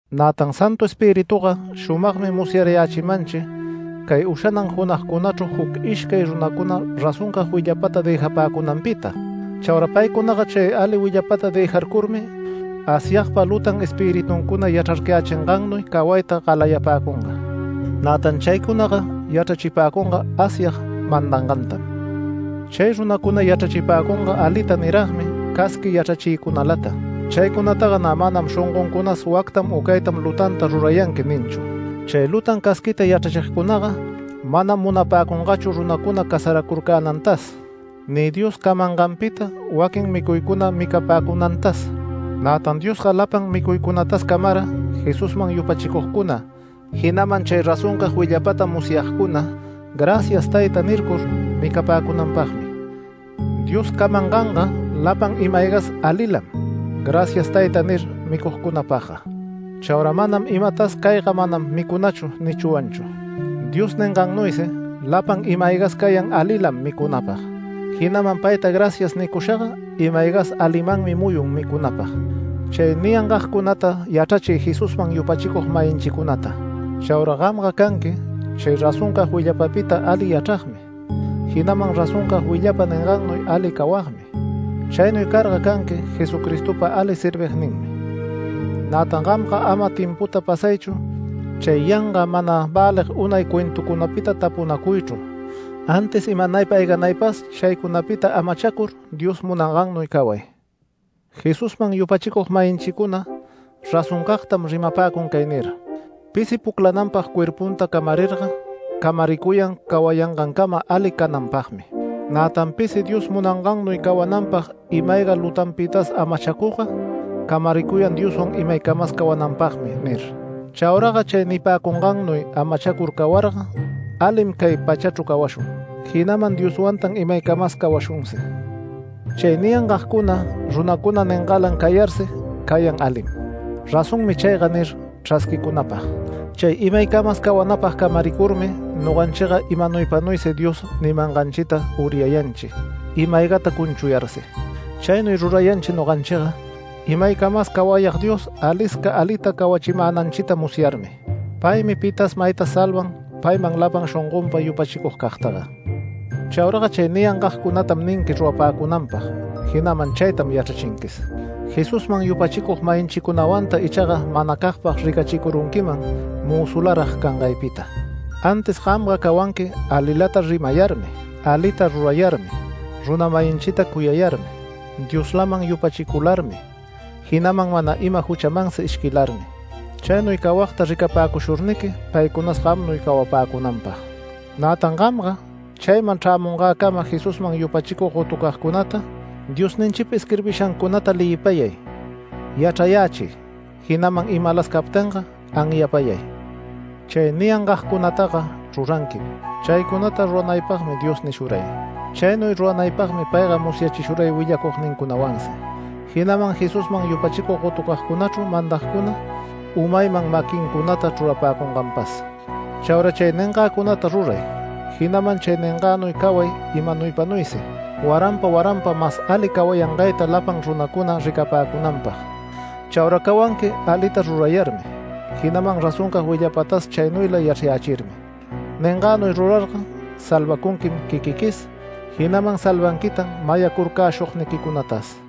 Nätan Santu Espirituga shumagmi musyarayächimanchi cay ushanan junagcunachru juc ishcay runacuna razoncag willapata dëjapäcunanpita. Chaura paycunaga ali willapata dëjarcurmi, Asyagpa lutan espirituncuna yachrarcayächingannuy cawayta galayapäcunga. Nätan chaycunaga yachrachipäcunga Asyag mandangantam. Chay runacuna yachrachipäcunga alita niragmi casqui yachrachiycunalata. Chaycunataga nä manam shongoncunas “Wactam u caytam lutanta rurayanqui” ninchu. Chay lutan casquita yachrachigcunaga manam munapäcungachu runacuna casaracurcänantas, ni Dios camanganpita waquin micuycuna micapäcunantas. Nätan Diosga lapan micuycunatas camara, Jesusman yupachicugcuna, jinaman chay razoncag willapata musyagcuna “Gracias Tayta” nircur micapäcunanpagmi. Dios camanganga lapan ima-aygas alilam “Gracias Tayta” nir micugcunapagga. Chaura manam imatas “Cayga manam micunachu” nichwanchu. Dios ningannuysi lapan ima-aygas cayan alilam micunäpag, jinaman payta “Gracias” nicushaga ima-aygas alimanmi muyun micunapag. Chay niyangagcunata yachrachiy Jesusman yupachicug-mayinchicunata. Chaura gamga canqui chay razoncag willapapita ali yachragmi, jinaman razoncag willapa ningannuy ali cawagmi. Chaynuy carga canqui Jesucristopa ali servigninmi. Nätan gamga ama timputa pasaychu chay yanga mana välig unay cuentucunapita tapunacuychru, antis imanaypa ayganaypas chaycunapita amachacur Dios munangannuy caway. Jesusman yupachicug-mayinchicuna razoncagtam rimapäcun cay nir: “Pisi puclananpag cuerpunta camarirga, camaricuyan cawayangancama ali cananpagmi. Nätan pisi Dios munangannuy cawananpag ima-ayga lutanpitas amachacugga camaricuyan Dioswan imaycamas cawananpagmi” nir. Chauraga chay nipäcungannuy amachacur cawarga alim cay pachachru cawashun, jinaman Dioswantan imaycamas cawashunsi. Chay niyangagcuna runacuna ningalan cayarsi cayan alim “Razonmi chayga” nir chrasquicunapag. Chay imaycamas cawanapag camaricurmi noganchiga imanaypanuysi Dios nimanganchita uryayanchi ima-aygata cunchuyarsi. Chaynuy rurayanchi noganchiga Imaycamas Cawayag Dios, alisca alita cawachimänanchita musyarmi. Paymi pitas maytas salvan payman lapan shongonpa yupachicugcagtaga. Chauraga chay niyangagcunatam ninqui rurapäcunanpag, jinaman chaytam yachrachinquis. Jesusman yupachicug-mayinchicunawanta ichaga manacagpag ricachicurunquiman mözularag cangaypita. Antis gamga cawanqui alilata rimayarmi, alita rurayarmi, runa-mayinchita cuyayarmi, Dioslaman yupachicularmi, jinaman mana ima juchamansi ishquilarmi. Chaynuy cawagta ricapäcushurniqui paycunas gamnuy cawapäcunanpag. Nätan gamga chayman chrämungäcama Jesusman yupachicug gotucagcunata, Diosninchipa isquirbishancunata leyipayay, yachrayächiy, jinaman imalas captinga anyapayay. Chay niyangagcunataga ruranquim. Chaycunata ruranaypagmi Dios nishuray. Chaynuy ruranaypagmi payga musyachishuray willacugnincunawansi, jinaman Jesusman yupachicug gotucagcunachru mandagcuna umayman maquincunata chrurapäcunganpas. Chaura chay ningagcunata ruray, jinaman chay ningagnuy caway imanaypanuysi, waranpa waranpa mas ali cawayangayta lapan runacuna ricapäcunanpag. Chaura cawanqui alita rurayarmi, jinaman razoncag willapatas chaynuyla yachrayächirmi. Ningagnuy rurarga salvacunquim quiquiquis, jinaman salvanquitan mayacurcäshugniquicunatas.